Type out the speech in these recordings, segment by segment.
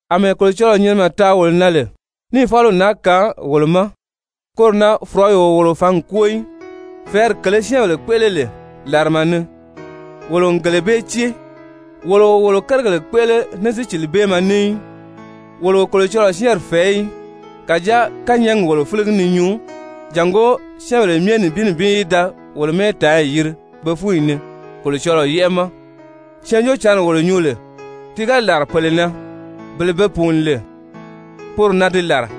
Amɛɛ Kolocɔlɔɔ nyinimɛ taa wolo na lè níì fáliw naa kaan wolo ma, koro na fɔ̀rɔyi o wolo fǎngi kwóo í. Fɛ̀ɛ́ri kèlē syɛ́ɛnbèle kpéʔele lè làrama ni, wolo n gele bee cée. Wolo o wolo kérigèle kpéʔele ní sícilibeemɛ ní í, wolo o Kolocɔlɔɔ syɛ́ɛnri fɛ̀ɛ́ í. Kàjáa kányɛɛgi wolo fíligi ni nyuu, jàngó syɛ́ɛnbèle myɛ nibin nibin í da wolo mɛ́ɛtaanyi yiri be fúnyi ni Kolocɔlɔɔ yɛ́ʔɛ ma. Syɛɛnjóocǎnri wolo nyuu lè, ti ga làra pèle na, bele be peyɛɛ pùuní lè, poro na di làra.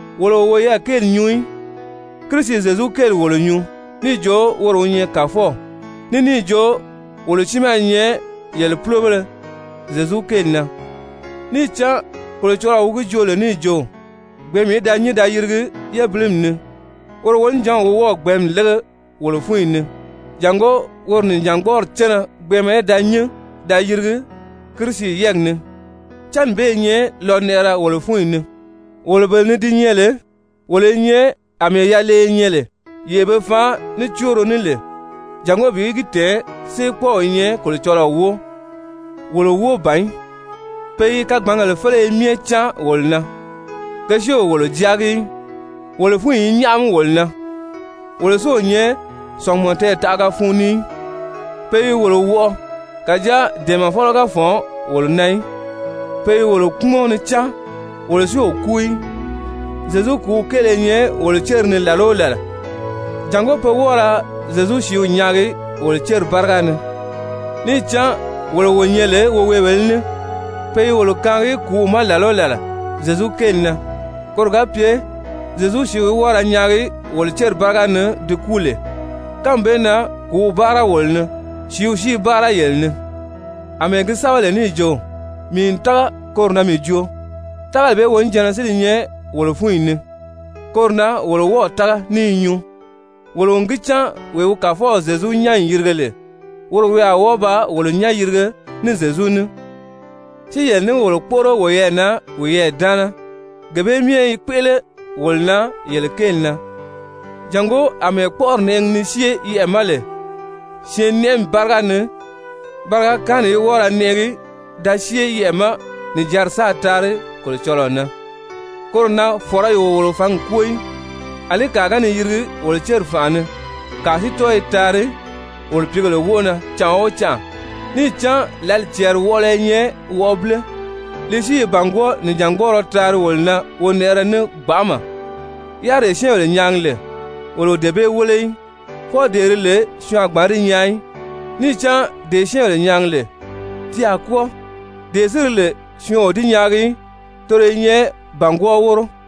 Wolo o woyɛɛ kéeli nyuu í, Kirisi Zyezu kéeli wolo nyuu níì jo woro wi nyɛ Kàfɔw, ní níì jo wolo tiimaa i nyɛ yele púlobéle Zyezu kéeli na. Níì cán Kolocɔlɔɔ wi gi joo lè níì jo: «Gbɛ̀ɛ́nmi í da nyín da yirigi yébilimi ni,» woro wonijanw wi wɔ́ɔ̀ gbɛ̀ɛ́nmi lége wolo fúnyi ni, jàngó woro nìjangbɔɔri cánna gbɛɛnmɛ í da nyín da yirigi Kirisi yɛ́ɛgi ni. Cánni bee i nyɛ lɔnɛʔɛrɛ wolo fúnyi ni, wolo bele ni di nyɛ lè wolo i nyɛ àmɛɛ yaleye nyɛ lè yee be faan ní cóoro ní lè, jàngó bi gi tɛ̀ɛn séekpɔɔw i nyɛ Kolocɔlɔɔ wóo, wolo wóo ban í. Pe i kagbangèle féleye myɛ cáan wolo na, ke si o wolo jáagi í. Wolo fúnyi i nyáʔami wolo na, wolo si o nyɛ sɔ̀ngumɔ tɛɛtaʔaga fun ni í. Pe i wolo wɔʔɔ, kàjáa dɛ̀ɛmɛfɔlɔ ga fɔ̀n wolo na í. Pe i wolo kpúmɔn ni cáan, wolo si o kúu í. Zyezu kùúw kéele i nyɛ wolo céri ni làla o làla, jàngó pe wɔ́ɔ ra Zyezu sìíw nyaagi wolo céri báriga ni. Níì cán wolo wo nyɛ lè woweebèlē ní, pe i wolo kaangi kùúw ma làla o làla Zyezu kéeli na, koro ga pye Zyezu sìíw í wɔ́ɔ ra nyaagi wolo céri báriga ni di kúu lè. Kánmi bee na kùúw báara wolo ni, sìíw si i báara yele ni. Amɛɛ gi sɛ́bɛ lè níì jo: «Mii n tága, koro na mii joo!» Tágali bee wonijanna si li nyɛ wolo fúnyi ni, koro na wolo wɔ́ɔ̀ tága ní i nyuu. Wolo n gi cán wee wi Kàfɔw Zyezu nyán n yìrige lè, woro wi a wɔ́ɔ ba wolo nyán yìrige ní Zyezu ní, si wolo ní yele kpóʔoro woyɛɛ na wiyɛɛ daana. Gee bee myɛ i kpéʔele wolo na yele kéeli na, jàngó àmɛɛ kpɔ́ʔɔri nɛʔɛgi ni syée yɛʔɛ̀ ma lè syɛɛnnɛʔɛmi báriga ni, bariga kaanni í wɔ́ɔ ra nɛʔɛgi da syée yɛʔɛ̀ ma, nìjanri sáā taari Kolocɔlɔɔ na. Koro na fɔ̀rɔyi o wolo fǎngi kwóo í. Alí kàa ga ni yirigi wolo céri fànʔa ni, kàa si tɔ́ɔ i taari wolo pìígèle wóʔo na canʔa o canʔa. Níì cán lǎli cɛɛri wɔʔɔlɔ i nyɛ wɔʔɔbile, li si i bàngwɔɔ nìjangbɔɔrɔ taari wolo na wonɛʔɛrɛ ní gbanʔama. Yáriree syɛ́ɛnbèle nyaagi lè, wolo o dee bee wéle í, fwɔɔ dee di lè syɔɔn a gbǎn di nyaa í. Níì cán dee syɛ́ɛnbèle nyaagi lè, ti a kwɔ́ɔ, dee si di lè syɔɔn o di nyaagi í, toro i nyɛ bàngwɔɔ wóro.